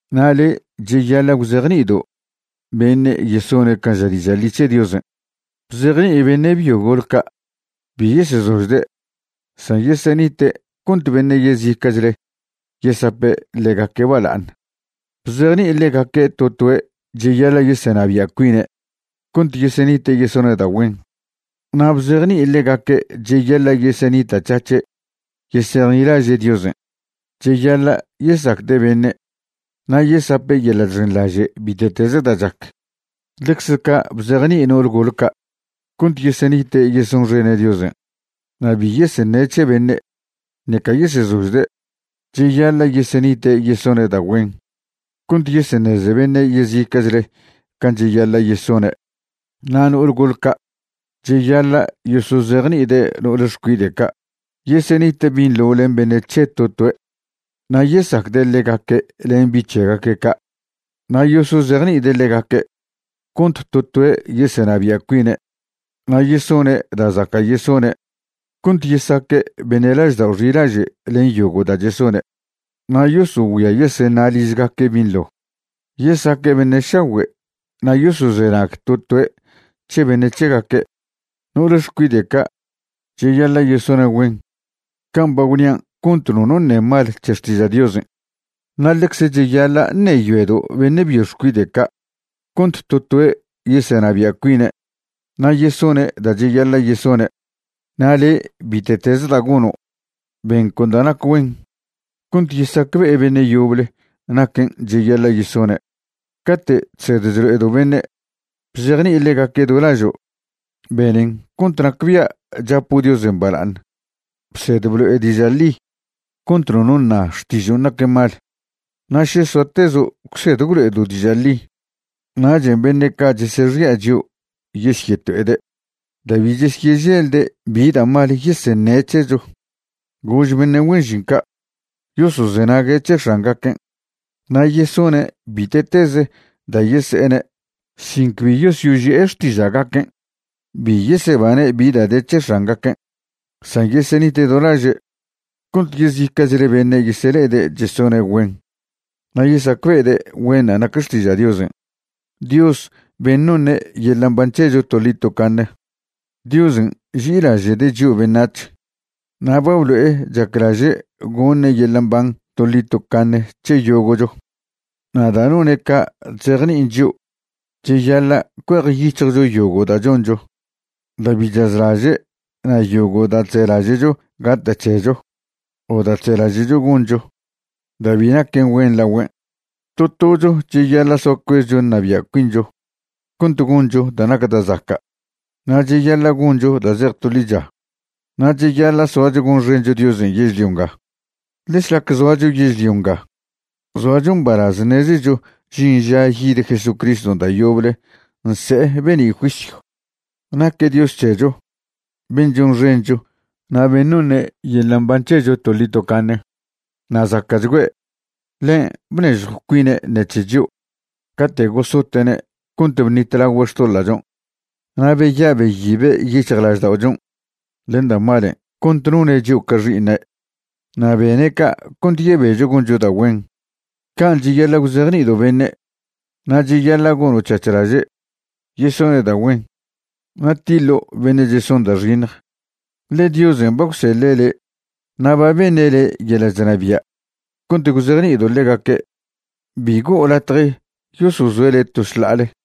Na' le', cheyaḻa' gwzejni'ido' beṉe' yesone' can' ža diža' ḻi c̱he Diosen'. Bzejni'i beṉe' byo gol ca' bi yesezožde', san yesenite' cont beṉe' yezica'chle yesape' ḻegaque' bala'aṉ. Bzejni'i ḻegaque' to toe' cheyaḻa' yesenabia' cuine' cont yesenite' yesone' da' güen, na' bzejni'i ḻegaque' cheyaḻa' yesenita'c̱hac̱he' yesejnilaže' Diosen'. Cheyaḻa' yesacde' beṉe' na' yesape' yeḻa' chxenḻaže' bite'teze da' chac. Ḻecze ca' bzejni'i no'ol gole ca' cont yesenite' yesonxene' Diosen', na' bi yeseṉe' c̱he beṉe', ṉeca yesezožde'. Cheyaḻa' yesenite' yesone' da' güen cont yeseṉeze beṉe' yezica'chle can' cheyaḻa' yesone'. Na' no'ol gol ca' cheyaḻa' yosozejni'ide' no'ol xcuide' ca' yesenite' binḻo len beṉe' c̱he to toe' na' yesacde' ḻegaque' len bi' c̱hegaque' ca'. Na' yosozejni'ide' ḻegaque' cont to toe' yesenabia' cuine' na' yesone' da' zaca' yesone' cont yesaque' beṉe' laždao' xilaže' len yogo' da' chesone', na' yosogüia yeseṉa' ližgaque' binḻo, yesaque' beṉe' šagüe' na' yosozenag to toe' c̱he beṉe' c̱hegaque'. No'ole xcuide' ca' cheyaḻa' yesone' güen can' ba gwnian' cont nono ṉe mal c̱he xtiža' Diosen'. Na' ḻecze cheyaḻa' ṉeyoedo' beṉe' byo xcuide' ca' cont to toe' yesenabia' cuine' na' yesone' da' cheyaḻa' yesone'. Na' le', bite'teze da' gono', ben con da' nac güen cont yesacbe'e beṉe' yoble naquen' cheyaḻa' yesone'. Cate' chsed chlo'edo' beṉe', bzejni'i ḻegaque' do lažo', benen cont nacbia' chapo' Diosen' bala'aṉ. Bsed blo'e diža' ḻi cont nono ṉa xtižon' naquen mal. Na' še soatezo' gwsed gwlo'edo' diža' ḻi, nachen' beṉe' ca' chesexi'a chio' yesyeto'ede' da' bi chesyeželde' bi da' mal yeseṉe' c̱hecho. Gož beṉe' güen žin ca' yosozenague' c̱he x̱angaquen' na' yesone' bite'teze da' yese'ene' sin cbi yosyoži'e xtiža'gaquen'. Bi yesebane' bi da' de c̱he x̱angaquen', san yesenite' do laže' cont yezica'chle beṉe' yesele'ede' chesone' güen na' yesacbe'ede' güenṉa' nac xtiža' Diosen', Dios ben' noṉe' yeḻa' mban c̱hecho toḻi tocaṉe. Diosen' nži'ilaže'de' chio' beṉac̱h na' ba blo'e chaclaže' goṉe' yeḻa' mban toḻi tocaṉe c̱he yogo'cho. Na' da' none' ca' chzejni'in chio' cheyaḻa' cuejyic̱hjcho yogo' da' choncho da' bi chazlaže' na' yogo' da' chzelaže'cho gata' c̱hecho o da' chzelaže'cho goncho da' bi naquen güen lagüen'. To tocho cheyaḻa' soa cuezcho ṉabia' cuincho cont goncho da' nac da' zaca'. Na' cheyaḻa' goncho da' zej to ḻicha; na' cheyaḻa' soacho gonxencho Diosen' yežlio nga. Ḻe šlac zoacho yežlio nga zoacho mbalaz ṉezecho žin ža yid Jesucriston' da' yoble nse'e be'ni' juisyw. Naque' Dios c̱hecho ben' chonxencho na' ben' noṉe' yeḻa' mban c̱hecho toḻi tocaṉe, na' zaca'chgüe'. Ḻen' bnežjw cuine' ṉec̱he chio' cate' gosote'ne' cont bṉitlagüe' xtoḻa'chon', na' beya' beyibe' yic̱hjlažda'ochon' len da' malen' cont none' chio' ca xi'iṉe'. Na' bene' ca' cont yebecho goncho da' güen. Can' cheyaḻa' gwzejni'ido' beṉe'. Na' cheyaḻa' goṉo' c̱hac̱h laže' yesone' da' güen na' tiḻo' beṉe' cheson da' xiṉj, ḻe Diosen' ba gwseḻe' le' na' ba beṉe' le' yeḻa' chnabia' cont gwzejni'ido' ḻegaque'. Bi go'o latje yosozoe' le' to šḻa'ale.